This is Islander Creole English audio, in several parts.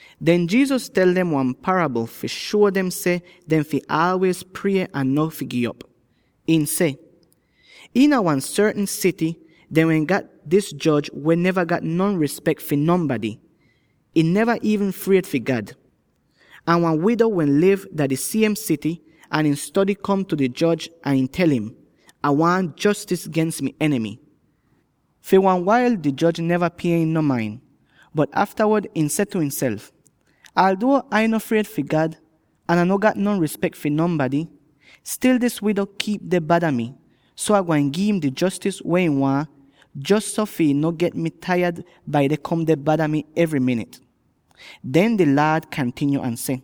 Den Jesus tel dem wan parabl fi shuo dem seh dehn fi aalwiez prie ahn no fi gi'op. Ihn seh: “Iina wan sortn sity dehn wehn gat dis joj weh neva gat no rispek fi nonbady; ihn neva iivn fried fi God. Ahn wan wido wehn liv dah di siem sity ahn ihn stody kom tu di joj ahn ihn tel im, ‘Ah waahn jostis gens mi enimy.’ “Fi wan wail di joj neva pie im non main; bot aftawod ihn seh tu ihnself, ‘Alduo Ai no fried fi God, ahn Ah no gat no rispek fi nonbady, stil dis wido kiip deh bada mi, so Ah gwain gi'im di jostis weh ihn waahn, jos so fi ihn no get mi taiyad bai deh kom deh bada mi evry minit.’” Den di Laad kantinyo ahn seh,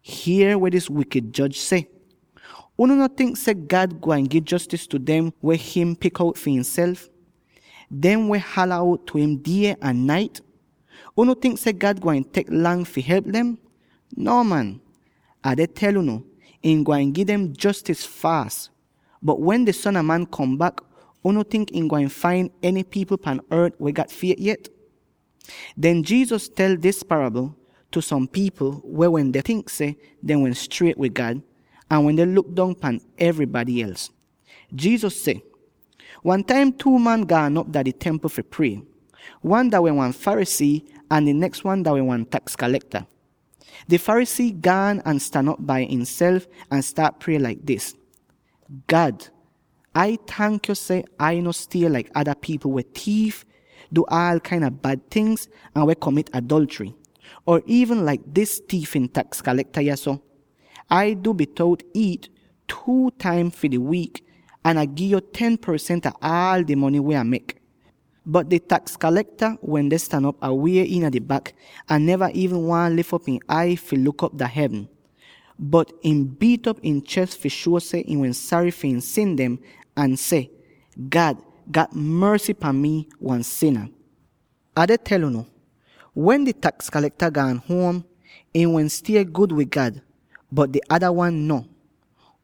“Hier weh dis wikid joj seh. Unu no tink seh God gwain gi jostis tu dem weh him pik out fi ihnself —dem weh hala out tu im die ahn nait? Unu tink seh God gwain tek lang fi help dem? No man! Ah deh tel unu: ihn gwain gi dem jostis faas. Bot wen di Son a Man kom bak, unu tink ihn gwain fain eny pipl pan ort weh gat fiet yet?” Den Jesus tel dis parabl tu som pipl weh wende tink seh dehn wehn striet wid God, ahn wende luk dong pan evrybady els. Jesus seh, “Wan taim two man gaan op dah di Templ fi prie. Wan dah wehn wan Pharisee, ahn di neks wan dah wehn wan taks kalekta. Di Pharisee gaan ahn stan op bai ihnself ahn staat prie laik dis: ‘God, Ai tank yo seh Ai no stie laik ada pipl weh tiif, du aal kain a bad tingz, ahn weh komit adolchry —or iivn laik dis tiifin taks kalekta yahso. Ai du bitout iit two taim fi di wiik, ahn Ah gi'yo ten porsent ah aal di mony weh Ah mek.’ Bot di taks kalekta wende stan op awie iina di bak, ahn neva iivn waahn lif op ihn ai fi luk op dah hevn. Bot ihn biit'op ihn ches fi shuo seh ihn wehn sary fi ihn sin dem, ahn seh, ‘God, gat morsy pan mi, wan sina!’ “Ah deh tel unu: wen di taks kalekta gaan huom, ihn wehn stie gud wid God, bot di ada wan no.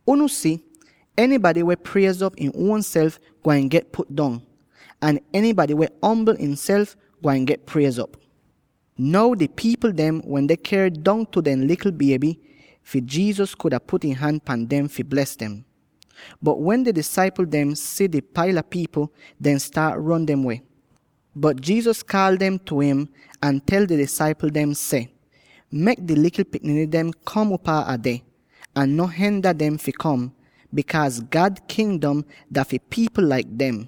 Unu si, enybady weh priez'op im uonself, gwain get put dong. Ahn enybady weh ombl ihnself, gwain get priez'op.” Now di pipl dem wende ker dongtu dehn likl bieby dem fi Jesus kuda put ihn han pahn dem fi bles dem. Bot wen di disaipl dem si di paila pipl, dehn staat ron dem weh. Bot Jesus kaal dem tu im, ahn tel di disaipl dem seh, “Mek di likl pikniny dem kom upaa Ah deh, ahn no henda dem fi kom, bikaaz God Kingdom dah fi pipl laik dem.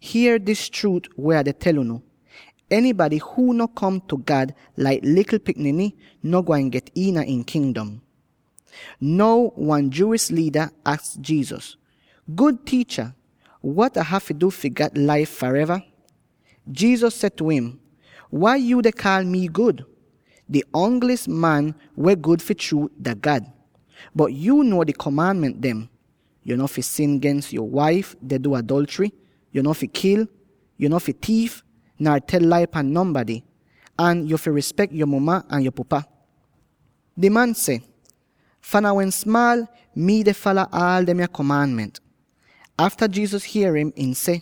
Hier dis chruut weh Ah deh tel unu: Enybady huu no kom tu God laik likl pikniny, no gwain get iina ihn Kingdom.” Now wan Jewish liida aks Jesus, “Gud Tiicha, wat Ah hafy du fi gat laif fareva?” Jesus seh tu im, “Wai yuu deh kaal mi gud? Di ongli'is wan weh gud fi chruut dah God. Bot yuu nuo di komaanment dem: ‘Yo no fi sin gens yo waif deh du adolchry; yo no fi kil; yo no fi tiif; nar tel lai pan nonbady; ahn yo fi rispek yo muma ahn yo pupa.’” Di man seh, “Fahn Ah wehn smaal, mii deh fala aal demya komaanment.” Afta Jesus hier im, ihn seh,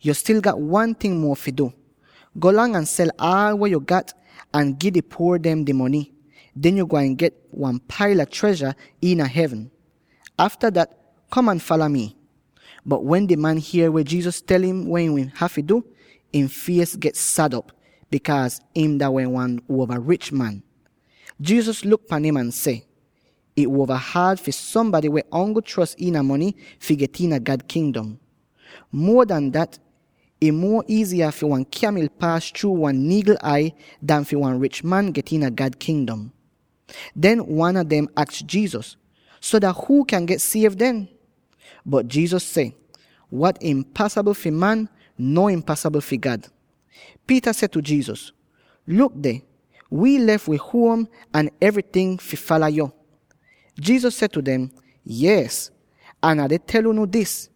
“Yo stil gat wan ting muo fi du: Golang ahn sel aal weh yo gat ahn gi di puor dem di mony; den yo gwain get wan paila trezha iina hevn. Afta dat, kom ahn fala mi.” Bot wen di man hier weh Jesus tel im weh ihn hafy du, ihn fies get sad op, bikaaz ihn dah wehn wan uova rich man. Jesus luk pan im ahn seh, “Ih uova haad fi sombady weh ongl chros iina mony fi get iina God Kingdom. Muo an dat, ih muo iiziya fi wan kyamil paas chruu wan niigl ai an fi wan rich man get iina God Kingdom.” Dehn wan a dem aks Jesus, “So, dah huu kyan get siev den?” Bot Jesus seh, “Wat impasabl fi man, no impasabl fi God.” Peter seh tu Jesus, “Luk deh, wi lef wi huom ahn evryting fi fala yo.” Jesus seh tu dem, “Yees, Ah deh tel unu dis: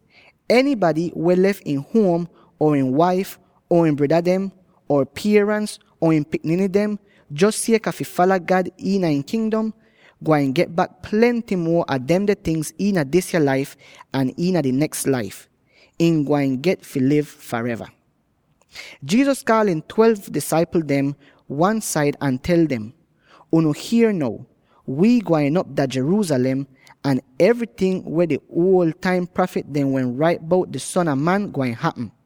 enybady weh lef ihn huom or ihn waif, or ihn breda dem, or pierans, or ihn pikniny dem, jos sieka fi fala God iina ihn Kingdom, gwain get bak plenty muo a demde tingz iina disya laif; ahn iina di neks laif, ihn gwain get fi liv fareva.” Jesus kaal ihn twelve disaipl dem wan-said ahn tel dem, “Unu hier now; wi gwain op dah Jerusalem ahn evryting weh di uol taim prafit dem wehn rait bout di Son a Man gwain hapm.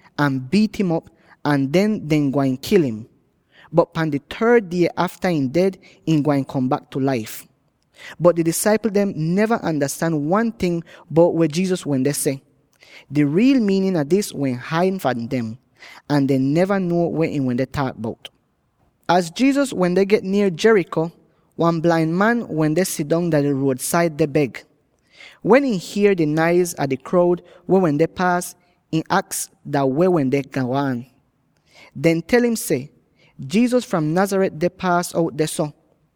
ahn biit'im op, ahn den dehn gwain kil im. Bot pahn di third die afta ihn ded, ihn gwain kom bak tu laif.” Bot di disaipl dem neva andastan wan ting bout weh Jesus wende seh. Di riil miinin a dis wehn haid fahn dem, ahn dehn neva nuo weh ihn wende taak bout. Az Jesus wende get nier Jericho, wan blain man wende sidong dah di ruod-said, deh beg. Wen ihn hier di naiz a di kroud weh wende paas, ihn aks dah weh wende go aan. Dehn tel im seh, “Jesus fram Nazareth deh paas out dehso.”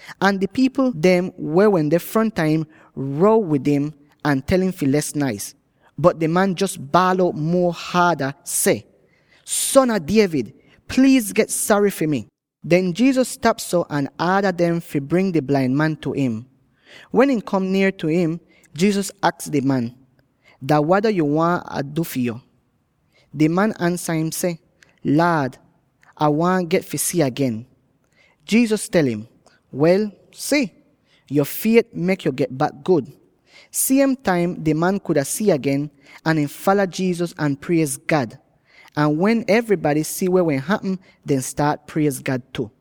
Ahn di pipl dem weh wende fronta im row wid im, ahn tel im fi les naiz, bot di man jos baal out muo haada seh, “Son a David, pliiz get sary fi mi!” Den Jesus stap dehso ahn aada dem fi bring di blain man tu im. Wen ihn kom nier tu im, Jesus aks di man, “Dah wada yo waahn Ah du fi yo?” Di man ansa im seh, “Laad, Ah waahn get fi si agen.” Jesus tel im, “Wel, si! Yo fiet mek yo get bak gud.” Siem taim di man kuda si agen; ahn ihn fala Jesus ahn priez God! Ahn wen evrybady si weh wehn hapm, dehn staat priez God tu.